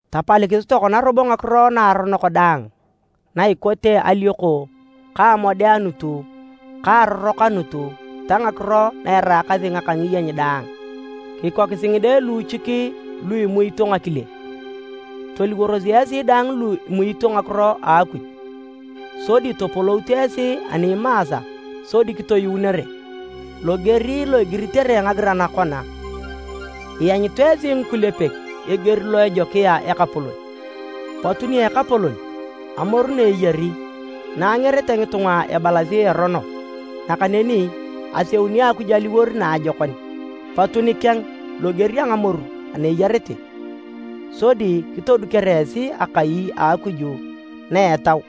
Tapalikisi tokona robo ngakiro naaronok daang na ikote alioko ka amodeanut ka arorokanut ta ngakiro na eraakasi ngaka ngiyeny daang. Kikokisi ngide luuchik lu imuito ngakile, toliworos esi dang lu kimuito ngakiro a Akuj, sodi topolout esi ani imaasa sodi kitoyuunere. Loger lo igiritere nagiran kona, “Ianyut esi ngikulepek eger lo ejokia Ekapolon.” Potu nia Ekapolon, amoru na eyari na angerete ngitunga ebalasi erono, nakaneni aseuni Akuj aliwor naajokon. Potu nikeng loger a ngamoru ana eyarete, sodi kitodukere esi akai a Akuj na etau,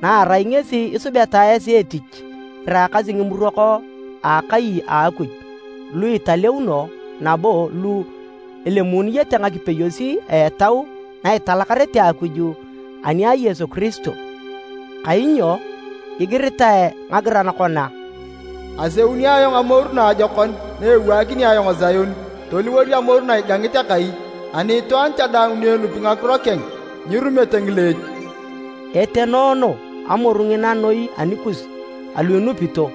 na erai ngesi isubeta esi etich iraakasi ngimurok a akai a Akuj lu italeuno nabo lu elemuununete ngakipeyos a etau na italakarete Akuj ani a Yesu Kiristo. Kainyo igiritae nagiran kona, “Aseuni ayong amoru naajokon, na ewaakini ayong Sion toliwor amoru na igangit akai, ani itwaan cha daang ni enupi ngakiro keng, nyirumete ngileech.” Etenoono amoru ngina noi anikus alu inupito,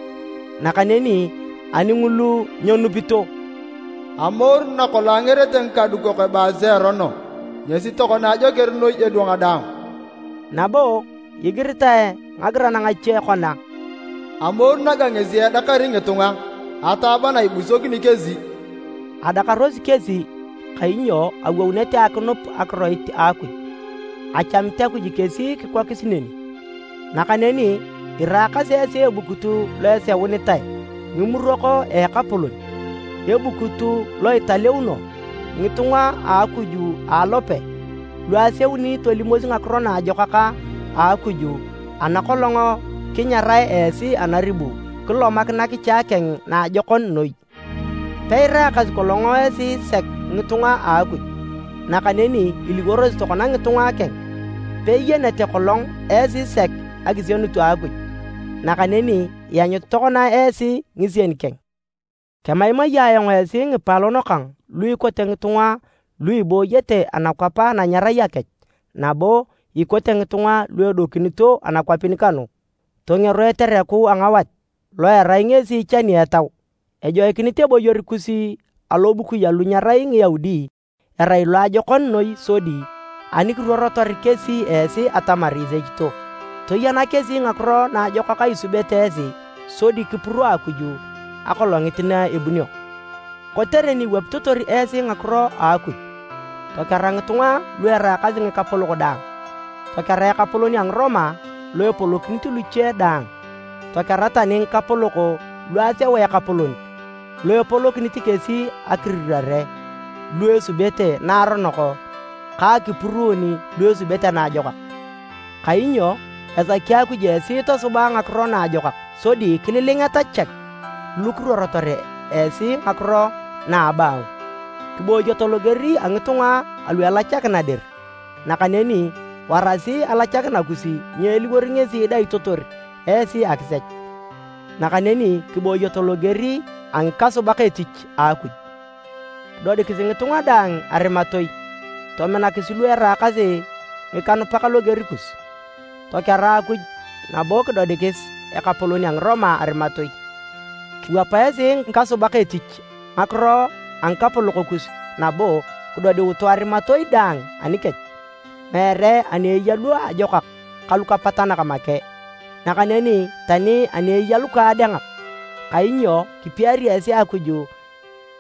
nakaneni ani ngulu nyenupito, “Amoru na kolong angerete ngikadukok ebaasi erono, ngesi tokona ajoker noi edwang daang.” Nabo igiritae nagiran ngache kona, “Amoru naga ngesi edakari ngitunga, ataaba na ibusokini kesi.” Adakarosi kesi kainyo awounete akinup akiroit a Akuj, achamit Akuj kesi kikokis neni. Nakaneni iraakasi esi ebukut lo eseunitae, ngimurok a Ekapolon, ebukut lo italeuno, ngitunga a Akuj a alope lu aseun tolimosi Ngakiro Naajokak a Akuj ana kolong kinyarae esi anaribu kilomak nakicha keng naajokon noi. Peiraakasi kolong esi sek ngitunga a Akuj, nakaneni iliworosi tokona ngitunga keng, peiyenete kolong esi sek akisienut a Akuj, nakaneni ianyut tokona esi ngisien keng. Kemaimai ayong esi ngipaalon kang lu ikote ngitunga lu ibooyete anakwap ana nyerai akech nabo ikote ngitunga lu edokinito anakwapin kanu! Tongero etereku a ngawat lo erai ngesi ichani etau. Ejoikinit eboyor kus alobukui alu nyerai Ngiyaudi erai loajokon noi sodi ani kiruorotor kesi esi atamar isechito, toyana kesi ngakiro naajokak isubete esi sodi kipuro Akuj Akolongit na ebunio. Kotere ni iwapitotor esi ngakiro a Akuj, tokera ngitunga lu eraakasi ngikapolok daang. Tokera ekapolon a Ngiroma lo epolokinit luche daang, tokera tani ngikapolok lu aseu ekapolon lo epolokinit kesi akirirare lu esubete naaronok ka akipuruun lu esubete naajokak. Kainyo esaki Akuj esi tosuba ngakiro naajokak sodi kililingeta chek lu kiruorotor esi ngakiro na a abaangu. Kibooyoto loger a ngitunga alu elachakina dir, nakaneni warasi alachakina kus nyeeliwor ngesi idaitotor esi akisech, nakaneni kibooyoto loger a ngikasubak etich a Akuj. Kidodikisi ngitunga daang arimatoi, tominakisi lu eraakasi ngikanupak loger kus, tokera Akuj nabo kidodikis ekapolon a Ngiroma arimatoi. Kiwapa esi ngikasubak etich ngakiro a ngikapolok kus nabo kidodiutu arimatoi daang anikech, meere ani eya lu ajokak ka lukapatanak make, nakaneni tani ani eya lukaadengak. Kainyo kipiari esi Akuj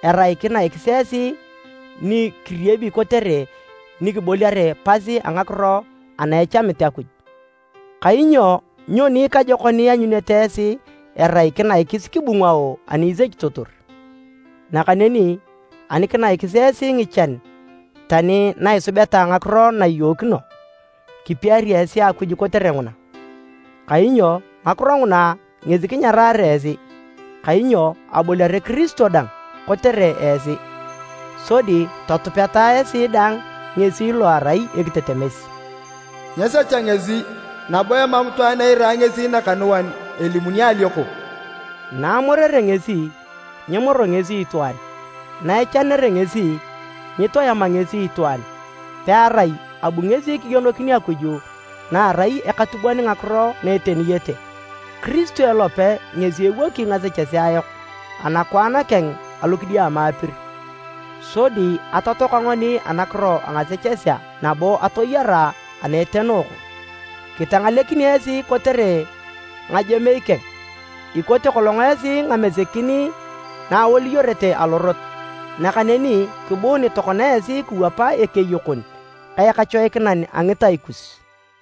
erai kinaikis esi ni kiriebi kotere ni kiboliare pas a ngakiro ana echamit Akuj. Kainyo nyoni ikajokon ianyunete esi erai kinaikis kibungao ani isechitotor? Nakaneni ani kinaikis esi ngichan tani na isubeta ngakiro na iyookino, kipiari esi Akuj kotere nguna. Kainyo ngakiro nguna ngesi kinyarare esi, kainyo aboliare Kiristo dang kotere esi, sodi totupeta esi dang ngesi lo erai ekitetemes. Nyesecha ngesi, nabo emam itwaan eira ngesi nakanuan elimuni alioko. Na amorere ngesi, nyemoro ngesi itwaan, na echanere ngesi, nyitoema ngesi itwaan, pearai abu ngesi kigienokin Akuj na erai akatubon ngakiro na eteniyete. Kiristo elope ngesi ewoki ngasechesea yok anakwaan keng alokidiama apir, sodi atotoaka ngoni anakiro a ngasechesea nabo atoyara ana etenooko. Kitangalekin esi kotere ngajemei keng. Ikote kolong esi ngamesekin na awoliyorete alorot, nakaneni kibuun tokona esi kiwapa Ekeyokon ka Ekachoikinan a ngitai kus.